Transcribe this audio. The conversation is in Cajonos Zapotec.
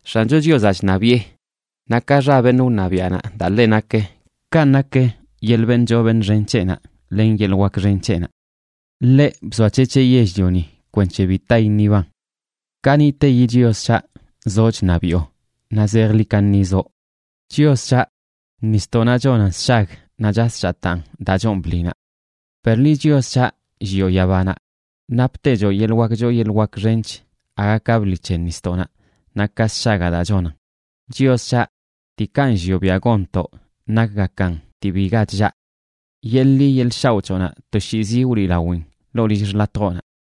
¡X̱ancho Chiozaꞌ chṉabiꞌe! Naꞌ ka xa beṉꞌ wṉabiaꞌnaꞌ daa ḻe nakə, kanꞌ nak yeḻꞌ beṉꞌ choo beṉꞌ xen c̱heꞌnaꞌ len yeḻꞌ wak xen c̱heꞌnaꞌ. Ḻeꞌ bzoac̱hec̱heꞌ yell-lioni, kwenc̱he bi ta iṉiban. Kaniꞌteyi Chios c̱haꞌ, zoꞌ chṉabiꞌo, naꞌ zejḻi kaṉi zoꞌ. Chios c̱haꞌ, nisdoꞌnaꞌ chonan sshag naꞌ chas chataan daa choon bḻinaꞌ. Per liꞌ, Chios c̱haꞌ, llioꞌ yabanaꞌ, naptechoꞌ yeḻꞌ wak choo yeḻꞌ wak xench aga ka bḻi c̱he nisdoꞌnaꞌ, naꞌ ka sshagaꞌ daa chonan. Chios c̱haꞌ, diikaꞌ nllioꞌ biaꞌ gonntoꞌ nakgakan dii biga chllaꞌ. ¡Yeḻꞌ ḻi yeḻꞌ shaoꞌ c̱hoꞌnaꞌ toshiizi wliꞌlawin ḻoo lill xḻatjoꞌnaꞌ!